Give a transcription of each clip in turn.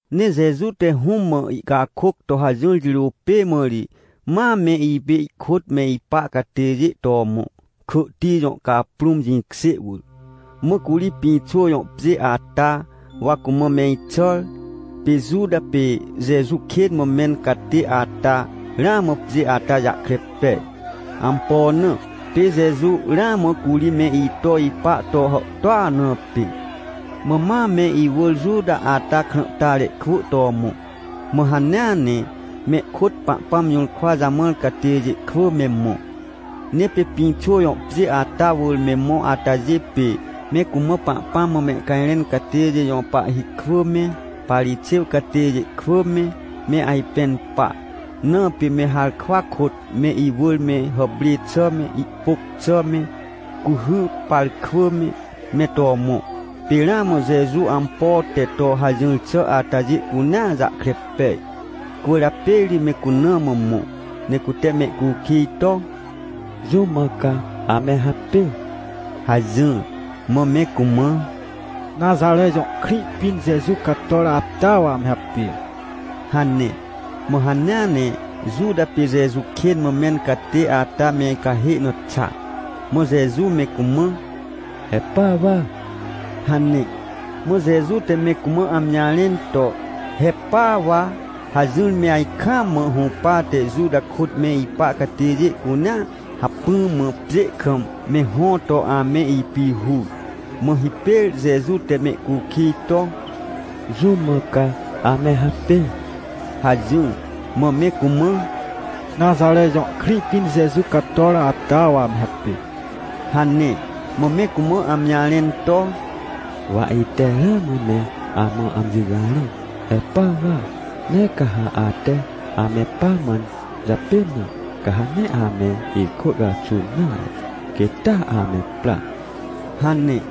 Ne Jeju te Hũm mã ihcakôc to hajỹr jirô pê mã ri ma me ipê ihkôt me ipa catêjê to mõ, Kỳhti jõ caprũm jĩkjê wỳr. Mã curi pĩxô jõ pjê ata, wa cumã me ixàr. Pê Juta pê Jeju kên mã mẽn catê ata ramã pjê ata jahkre pej. Ampo na? Pê Jeju ramã curi me ito ipa to hàhtôa na pê. Mã ma me iwỳr Juta ata krãhtare kwỳ to mõ, mã hanea ne mehkôt Pahpãm jũrkwa jamãr catêjê kwỳ me mõ. Ne pê Pĩxô jõ pjê ata wỳr me mõ atajê pê, me cumã Pahpãm mã mehcajrẽn catêjê jõ pahhi kwỳ me, Parixêw catêjê kwỳ me, me ajpẽn pa, na pê me harkwa kôt me iwỳr me hàprê xà me, ihpôc xà me, cuhy pàr kwỳ me, me to mõ. Pê ramã Jeju ampo te to hajỹr xà atajê cunea jahkre pej. Cwỳrjapê ri me cuna mã mõ, ne cute mehcukij to: — Jũm mã ca ame hapê? — hajỹr. Mã me cumã: — Naxare jõ krĩ pĩn Jeju cator ata wa ame hapê — hane. Mã hanea ne Juta pê Jeju kên mã mẽn catê ata me cahê na xa. Mã Jeju me cumã: — He pa wa! — hane. Mã Jeju te me cumã amji jarẽn to: “He pa wa” hajỹr, me ajkaam mã hũpate Juta kôt me ipa catêjê cunea, hacpỹ mã pjê kam me hõ to ame ipihur. Mã hipêr Jeju te mehcukij to: — Jũm mã ca ame hapê? — hajỹr. Mã me cumã: — Naxare jõ krĩ pĩn Jeju cator ata wa ame hapê — hane. Mã me cumã amji jarẽn to: — Wa ite ramã me amã amji jarẽn, he pa wa. Ne ca ha ate ame pamãn japên na, ca ha nee ame ikwỳ caxun nare, quêt taa ame pra — hane.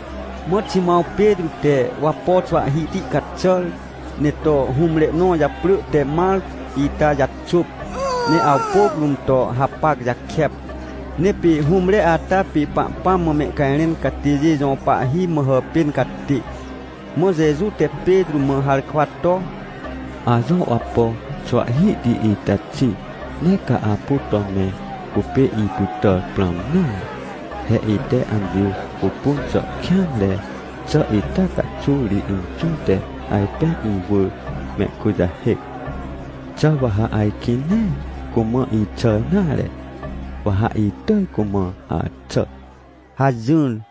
Mã Ximãw Petrô te wapo xwahhihti caxàr, ne to hũmre nõ japrỳ te Marco ita jaxôp, ne awpôc rũm to hapac jakep. Ne pê hũmre ata pê Pahpãm mã mehcajrẽn catêjê jõ pahhi mã hàpên catê. Mã Jeju te Petrô mã harkwa to: — Ajõ wapo xwahhihti ita xi, nee ca apu to me cupê ipytàr prãm nare. He ite amji pupun xà kêanre xà ita caxuw ri Inxũ te ajpên iwỳr mehkujahêc. Xà wa ha ajkĩ nee cumã ixàr nare? Wa ha itỳj cumã axà — hajỹr.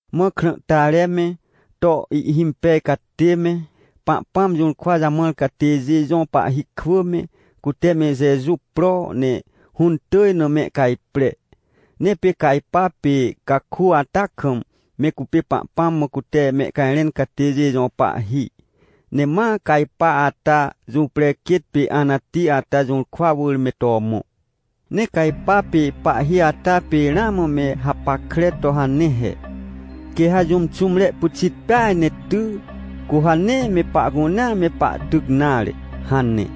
Mã krãhtare me, to ihhimpej catê me, Pahpãm jũrkwa jamãr catêjê jõ pahhi kwỳ me, cute me Jeju pro, ne hũntỳj na mehcajpre. Ne pê Cajpa pê caku ata kam, me cupê Pahpãm mã cute mehcajrẽn catêjê jõ pahhi. Ne ma Cajpa ata jũprequêt pê Anati ata jũrkwa wỳr me to mõ. Ne Cajpa pê pahhi ata pê ramã me hapackre to hane he: “Quê ha jũm xũmre pyxit peaj ne ty, cu ha nee me pahcunea me pahtyc nare” hane.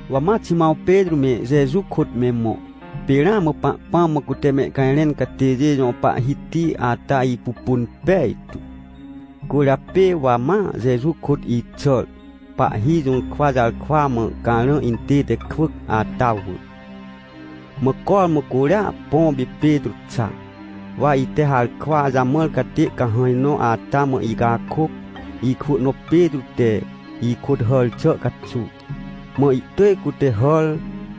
Wa ma Ximãw Petrô me, Jeju kôt me mõ. Pê ramã Pahpãm mã cute mehcajrẽn catêjê jõ pahhiti ata ipupun pejtu. Cwỳrjapê wa ma Jeju kôt ixàr, pahhi jũrkwa jarkwa mã carã intête kwỳc ata wỳr. Mã cormã curia, põ pê Petrô xa. Wa ite harkwa jamãr catê cahãj nõ ata mã icakôc, ikwỳ nõ Petrô te ikôt hàr xà caxuw. Mã ihtỳj cute hàr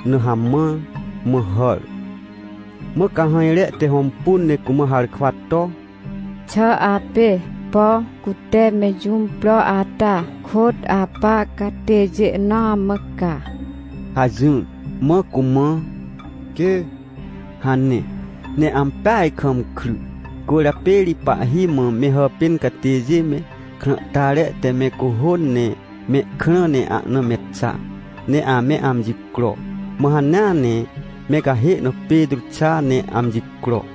na hamãr, mã hàr. Mã cahãjre te hõmpun ne cumã harkwa to: — Xà apê, por cute me jũm pro ata kôt apa catêjê nõ amã ca? — hajỹr. Mã cumã: — Quê! — hane. Ne ampeaj kam kry, cwỳrjapê ri pahhi mã me hàpên catêjê me, krãhtare te me cuhôn, ne mehkrã ne ahna me xa, ne ame amji cro. Mã hanea ne me cahê na Petrô xa ne amji cro.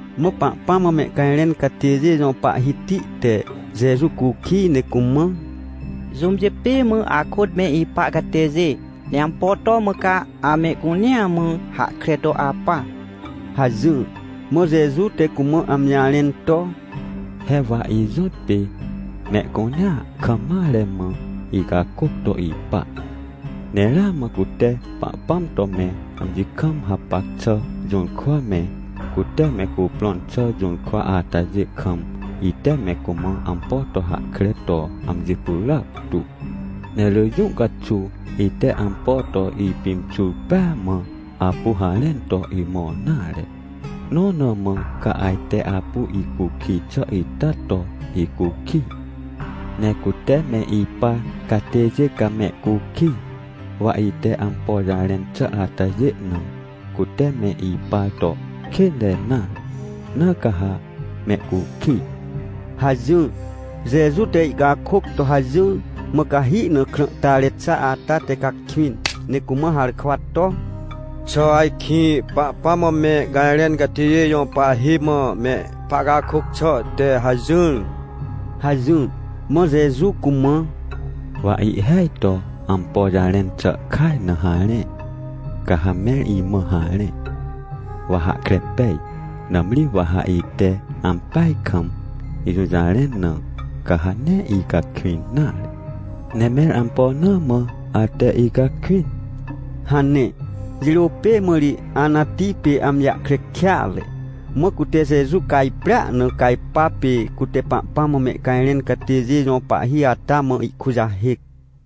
Mã Pahpãm mã mehcajrẽn catêjê jõ pahhiti te Jeju cukij ne cumã: — Jũmjê pê mã akôt me ipa catêjê? Ne ampo to mã ca amehcunea mã hahkre to apa? — hajỹr. Mã Jeju te cumã amji jarẽn to: — He wa ijõtpê mehcunea kam mare mã icakôc to ipa. Ne ramã cute Pahpãm to me amji kam hapac xà jũrkwa me, cute me cuprõn xà jũrkwa atajê kam, ite me cumã ampo to hahkre to amji pyràc tu. Ne rỳ jũ caxuw ite ampo to ipimxur pêa mã apu harẽn to imõr nare, nõ na mã ca ajte apu icukij xà ita to icukij? Ne cute me ipar catêjê ca mehcukij, wa ite ampo jarẽn xà atajê na, cute me ipar to kênre nare. Na ca ha mehcukij — hajỹr. Jeju te ihcakôc to hajỹr. Mã cahi na krãhtare xa ata te cakwĩn, ne cumã harkwa to: — Xà ajkĩ Pahpãm mã mehcajrẽn catêjê jõ pahhi mã me pahcakôc xà te hajỹr? — hajỹr. Mã Jeju cumã: — Wa ihhêaj to ampo jarẽn xà kaj na harẽ, ca ha mẽr imã harẽ, wa hahkre pej. Nãmri wa ha ite ampeaj kam ijũjarẽn na, ca ha nee icakwĩn nare. Ne mẽr ampo na mã ate icakwĩn? — hane. Jirô pê mã ri Anati pê amji jahkre kêatre, mã cute Jeju cajprea na Cajpa, pê cute Pahpãm mã mehcajrẽn catêjê jõ pahhi ata mã ihkujahêc.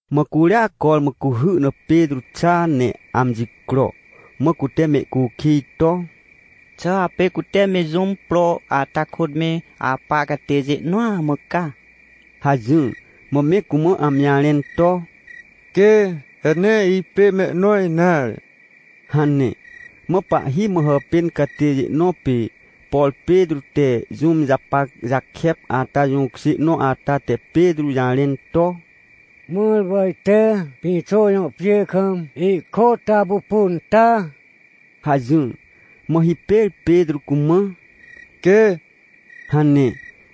Mã curia cormã cuhy na Petrô xa, ne amji cro. Mã cute mehcukij to: — Xà apê cute me jũm pro ata kôt me apa catêjê nõa mã ca? — hajỹr. Mã me cumã amji jarẽn to: — Quê, he nee ipê mehnõ nare — hane. Mã pahhi mã hàpên catêjê nõ pê, por Petrô te jũm japac jakep ata jũkjê nõ ata, te Petrô jarẽn to: — Mãr wa ite Pĩxô jõ pjê kam ihkôt apupun ta? — hajỹr. Mã hipêr Petrô cumã: — Quê — hane,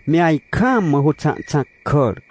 me ajkaam mã hôxãhxãc kàr.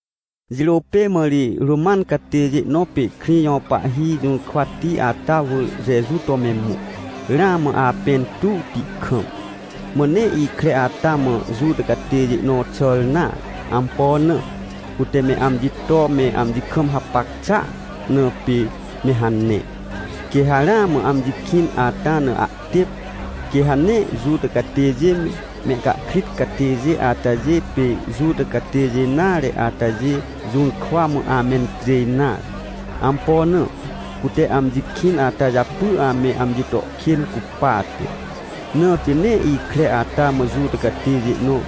Jirô pê mã ri Roman catêjê nõ pê krĩ jõ pahhi jũrkwati ata wỳr Jeju to me mõ, ramã apẽ intuwti kam. Mã nee ikre ata mã Juta catêjê nõ xàr nare. Ampo na? Cute me amji to me amji kam hapac xàa na pê me hane. Quê ha ramã amji kĩn ata na ahtêp, quê ha nee Juta catêjê me, mehcahkrit catêjê atajê pê Juta catêjê nare atajê jũrkwa mã amencjêj nare. Ampo na? Cute amji kĩn ata japy ame amji to kên cupate. Na pê nee ikre ata mã Juta catêjê nõ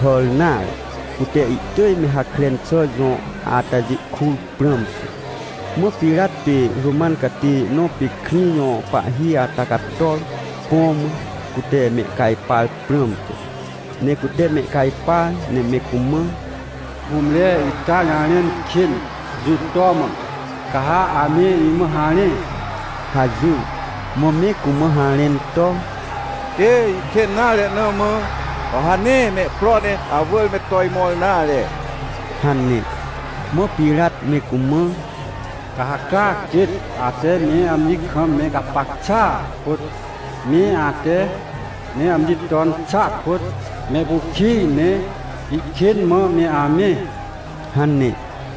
hàr nare, cute ihtỳj me Hakren xà jõ atajê kur prãmte. Mã Pirat pê Roman catêjê nõ pê krĩ jõ pahhi ata cator, põ mã, cute mehcajpar prãmte. Ne cute mehcajpar ne me cumã: — Hũmre ita jarẽn kên jũ to mã, ca ha ame imã harẽ? — hajỹr. Mã me cumã harẽn to: — Quê ihkên nare na mã, wa ha nee mehpro ne awỳr me to imõr nare — hane. Mã Pirat me cumã: — Ca ha caa quêt, ate me amji kam me gapac xàa kôt, me ate me amji ton xàa kôt, mehcukij ne ihkên mã me amẽ — hane.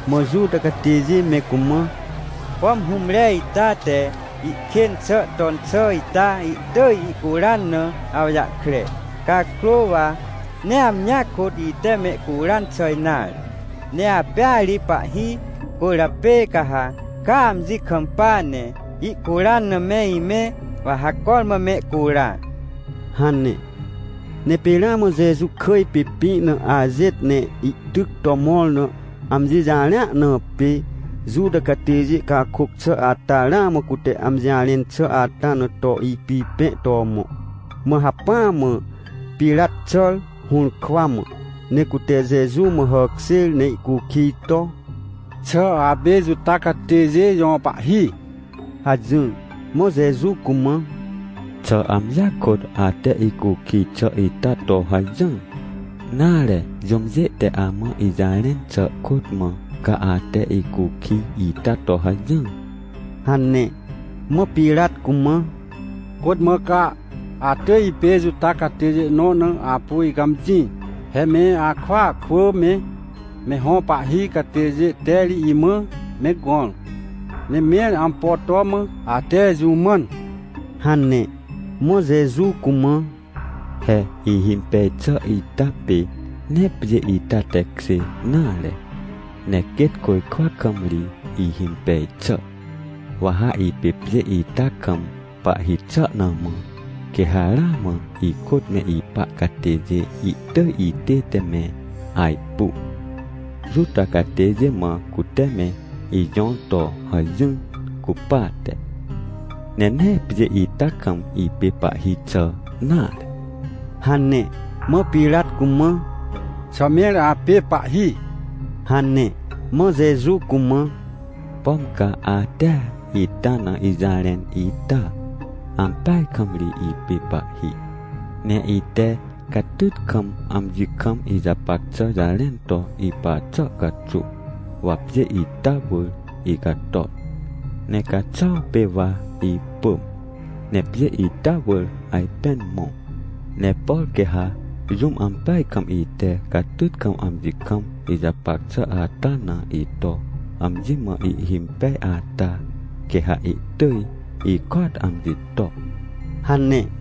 Mã Juta catêjê me cumã: — Pom hũmre ita te ihkên xà ton xà ita ihtỳj ihcuran na awjahkre. Cakrô wa nee amjia kôt ite mehcuran xà nare, ne apêa ri pahhi, cwỳrjapê ca ha caa amji kampa, ne ihcuran na me imẽ, wa ha cormã mehcura — hane. Ne pê ramã Jeju kỳj pê, pĩ na ajêt ne ihtyc to mõr na amji jarẽa na pê, Juta catêjê cakôc xà ata ramã cute amji jarẽn xà ata na to ipipẽ to mõ. Mã hacpỹa mã Pirat xàr, hũrkwa mã, ne cute Jeju mã hàkjêr ne ihcukij to: — Xà apê Juta catêjê jõ Pahhi? — hajỹr. Mã Jeju cumã: — Xà amjia kôt ate icukij xà ita to hajỹr? Nare jũmjê te amã ijarẽn xà kôt mã ca ate icukij ita to hajỹr? — hane. Mã Pirat cumã: — Côt mã ca atỳj ipê Juta catêjê nõ na apu icãmjĩ? He me akwỳa kwỳ me, me hõ pahhi catêjê te ri imã me gõr. Ne mẽr ampo to mã ate jũ mãn? — hane. Mã Jeju cumã: — He ihimpej xà ita pê nee pjê ita tekjê nare, ne quêt côjkwa kam ri ihimpej xà. Wa ha ipê pjê ita kam pahhi xà na mã, quê ha ramã ikôt me ipa catêjê ihtỳj itête me ajpu, Juta catêjê mã cute me ijõr to hajỹr cupate. Ne nee pjê ita kam ipê pahhi xà nare — hane. Mã Pirat cumã: — Xà mẽr apê pahhi? — hane. Mã Jeju cumã: — Pom ca atea ita na ijarẽn ita? Ampeaj kam ri ipê Pahhi, ne ite catyt kam amji kam ijapac xà jarẽn to ipa xà caxuw, wa pjê ita wỳr icator, ne caxuaw pê wa ipỳm, ne pjê ita wỳr ajpên mõ. Ne por quê ha jũm ampeaj kam ite catyt kam amji kam ijapac xà ata na ito amji mã ihhimpej ata, quê ha ihtỳj ikôat amji to — hane.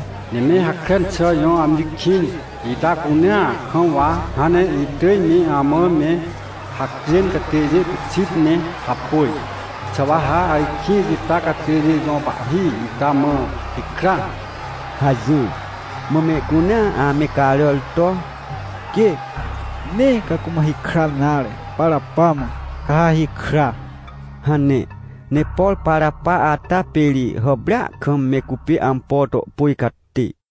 Ne me Hakren xà jõ amji kĩn ita cunea kam wa hãn ne itỳj me amã me hacjên catêjê pyxit ne hapôj. Xà wa ha ajkĩ Juta catêjê jõ Pahhi ita mã hikra? — hajỹr. Mã mehcunea ame caràr to: — Quê, nee ca cumã hikran nare, Parapa mã, ca ha hikra — hane. Ne por Parapa ata pê ri hàprêa kam me cupê ampo to pôj catê.